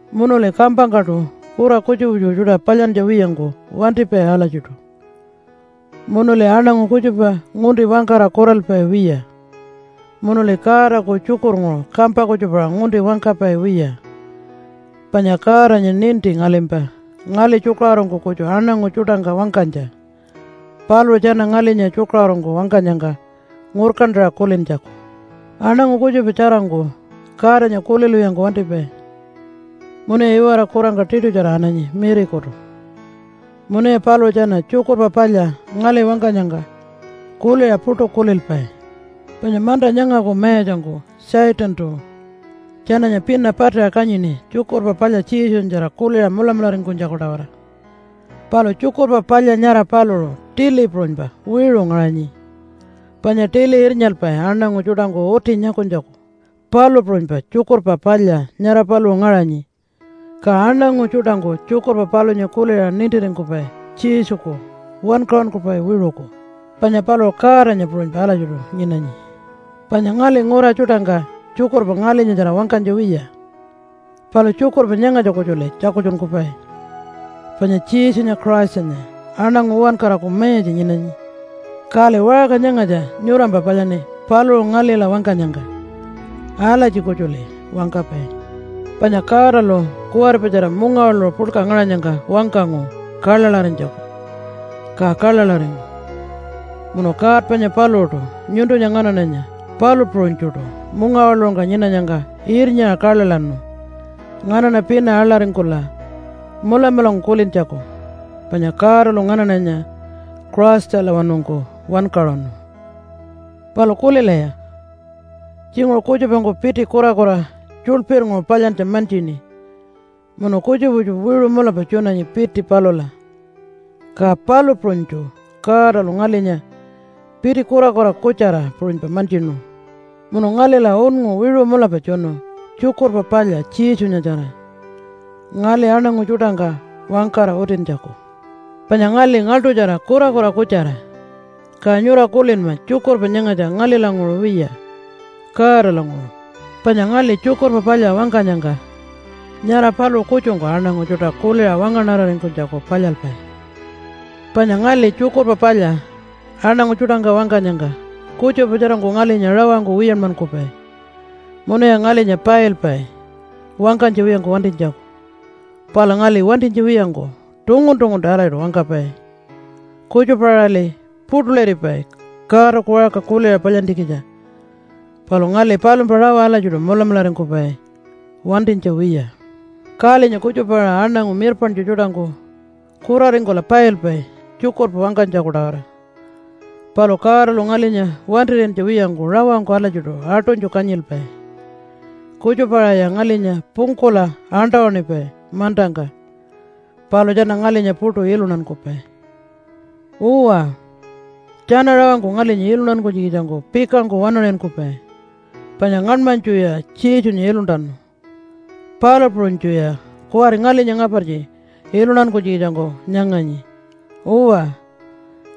Munuli kampangkaṯu kura kutjupa kutjupa tjuṯa palyantja wiyangku wantipai alatjiṯu, munuli aṉangu kutjupa ngunti wangkara kuralpai wiya, munuli Godaku tjukurnguṟu kampa kutjupaṟa ngunti wangkapai wiya. Panya Godanya ninti ngalimpa ngali tjukaṟurungku kutju aṉangu tjuṯangka wangkanytja paluṟu tjana ngalinya tjukaṟurungku wangkanyangka ngurkantaṟa kulintjaku. Aṉangu kutjupa tjarangku Godanya kulilwiyangku wantipai munuya iwara kurangka tiṯutjara ananyi mirikutu. Munuya paluṟu tjana Tjukurpa Palya ngali wangkanyangka kuliṟa puṯu kulilpai. Panya manta nyangaku mayatjangku Satantu tjananya pina patiṟa kanyini Tjukurpa Palya Jesunyatjara kuliṟa mulamularingkunytjaku-tawara. Palu Tjukurpa Palya nyara paluṟu tili puṟunypa wiṟu ngaṟanyi, panya tili irnyalpai aṉangu tjuṯangku uti nyakunytjaku, palu puṟunypa Tjukurpa Palya nyara paluṟu ngaṟanyi, ka aṉangu tjuṯangku tjukurpa palunya kuliṟa nintiringkupai Jesuku wankaṟunkupai wiṟuku, panya paluṟu Godanya puṟunypa alatjiṯu nyinanyi. Panya ngali ngura tjuṯangka tjukurpa ngalinyatjara wangkanytja wiya, palu tjukurpa nyangatja kutjuli tjakultjunkupai panya Jesunya Christanya aṉangu uwankaraku mayatja nyinanyi. Kali waṟka nyangatja nyurampa palyaṉi paluṟu ngalila wangkanyangka. Alatji kutjuli wangkapai. Panya Godalu kuwaripatjara mungawaḻuṟu puḻka ngaṟanyangka wangkangu kaḻaḻarinytjaku ka kaḻaḻaringu, munu God panya paluṟuṯu nyuntunya nganaṉanya palu puṟunytjuṯu mungawaḻuṟungka nyinanyangka irnyaṟa kaḻaḻaṉu nganaṉa pina aḻaringkula mulamulangku kulintjaku panya Godalu nganaṉanya Christalawanungku wankaṟunu. Palu kulilaya! Tjinguṟu kutjupangku piti kurakura tjuḻpirnguṟu palyantja mantjini munu kutjupa kutjupa wiṟu mulapa tjunanyi piti palula. Ka palu puṟunytju Godalu ngalinya piti kurakura kutjara puṟunypa mantjinu, munu ngalila unngu wiṟu mulapa tjunu Tjukurpa Palya Jesunyatjara ngali aṉangu tjuṯangka wangkara utintjaku. Panya ngali ngaḻṯutjara kurakura kutjara ka nyura kulinma tjukurpa nyangatja ngalilanguṟu wiya, Godalanguṟu. Panya ngali Tjukurpa Palya wangkanyangka nyara paluṟu kutjungku aṉangu tjuṯa kuliṟa wangaṉararingkunytjaku palyalpai. Panya ngali Tjukurpa Palya aṉangu tjuṯangka wangkanyangka kutjupa tjarangku ngalinya rawangku wiyanmankupai munuya ngalinya pailpai wangkanytja wiyangku wantinytjaku. Palu ngali wantinytja wiyangku tungun-tunguntu alatjiṯu wangkapai. Kutjupa-aṟali puṯuliripai Godaku waṟka kuliṟa palyantjikitja, palu ngali palumpa rawa alatjiṯu mulamularingkupai wantinytja wiya. Kalinya kutjupa-aṟa aṉangu mirpaṉtju tjuṯangku kuraringkula pailpai tjukurpa wangkanytjaku-tawara, palu Godalu ngalinya wantir'iyantja wiyangku rawangku alatjiṯu aṯunytju kanyilpai. Kutjupa-aṟaya ngalinya pungkula aṉṯa-waṉipai mantangka, palu tjana ngalinya puṯu iluntankupai. Uwa, tjana rawangku ngalinya iluntankunytjikitjangku pikangku waṉaṟinkupai, panya ngaṉmanytjuya Jesunya iluntanu, palu puṟunytjuya kuwari ngalinya ngapartji iluntankunytjikitjangku nyanganyi. Uwa,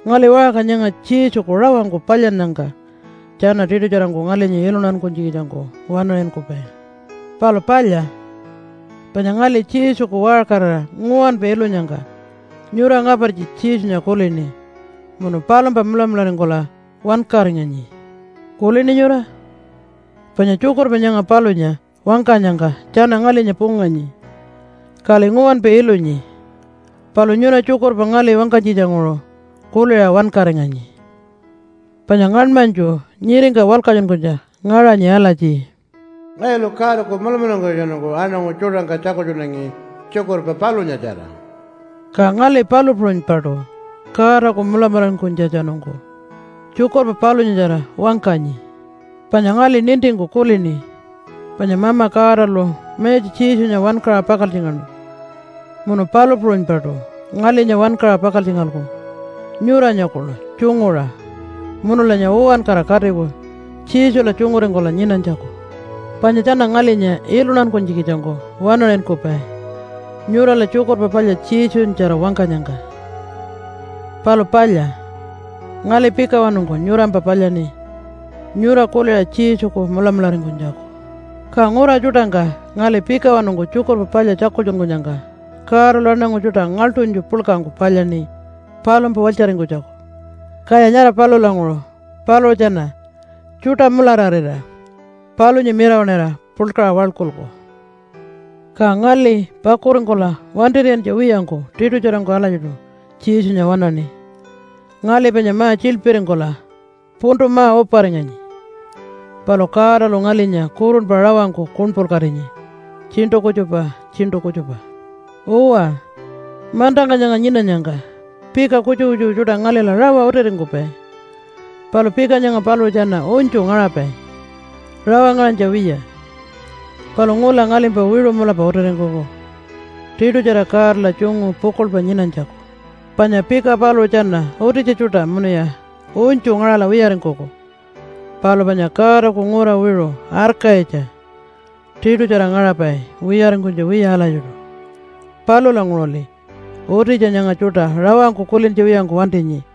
ngali waṟka nyanga Jesuku rawangku palyannyangka tjana tiṯutjarangku ngalinya iluntankunytjikitjangku waṉaṟinkupai. Palu palya, panya ngali Jesuku waṟkarira nguwanpa ilunyangka nyura ngapartji Jesunya kulini munu palumpa mulamularingkula wankaringanyi. Kulini nyura? Panya tjukurpa nyanga palunya wangkanyangka tjana ngalinya punganyi, kali nguwanpa ilunyi, palu nyura tjukurpa ngali wangkanytjitjanguṟu kuliṟa wankaringanyi. Panya ngaṉmanytju nyiringka walkatjunkunytja ngaṟanyi alatji, “Ngayulu Godaku mulamularingkunytjatjanungku aṉangu tjuṯangka tjakultjunangi tjukurpa palunyatjara.” Ka ngali palu puṟunypaṯu Godaku mulamularingkunytjatjanungku tjukurpa palunyatjara wangkanyi. Panya ngali nintingku kulini panya Mama Godalu Mayatja Jesunya wankaṟa pakaltjingaṉu munu palu puṟunypaṯu ngalinya wankaṟa pakaltjingalku nyuranya kuḻu tjunguṟa munulanya uwankara katiku Jesula tjunguringkula nyinanytjaku. Panya tjana ngalinya iluntankunytjikitjangku waṉaṟinkupai nyurala Tjukurpa Palya Jesunyatjara wangkanyangka. Palu palya, ngali pikawanungku nyurampa palyaṉi nyura kuliṟa Jesuku mulamularingkunytjaku. Ka ngura tjuṯangka ngali pikawanungku Tjukurpa Palya tjakultjunkunyangka Godalu aṉangu tjuṯa ngaḻṯunytju puḻkangku palyaṉi palumpa walytjaringkunytjaku, kaya nyara palulanguṟu paluṟu tjana tjuṯa mulararira palunya mirawaṉira puḻkaṟa waḻkulku. Ka ngali pakuringkula wantir'iyantja wiyangku tiṯutjarangku alatjiṯu Jesunya waṉaṉi. Ngali panya ma-tjiḻpiringkula puntu ma-uparinganyi, palu Godalu ngalinya kurunpa rawangku kuṉpulkatinyi tjiṉṯu kutjupa tjiṉṯu kutjupa. Uwa, mantangka nyanga nyinanyangka pika kutjupa kutjupa tjuṯa ngalila rawa utiringkupai. Palu pika nyanga paluṟu tjana unytju ngaṟapai, rawa ngaṟanytja wiya, palu ngula ngalimpa wiṟu mulapa utiringkuku tiṯutjara Godala tjungu pukuḻpa nyinanytjaku. Panya pika paluṟu tjana utitja tjuṯa munuya unytju ngaṟala wiyaringkuku, palu panya Godaku ngura wiṟu arkayitja tiṯutjara ngaṟapai wiyaringkunytja wiya alatjiṯu. Palulanguṟuli utitja nyanga tjuṯa rawangku kulintja wiyangku wantinyi,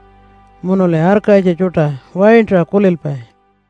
munuli arkayitja tjuṯa waintaṟa kulilpai.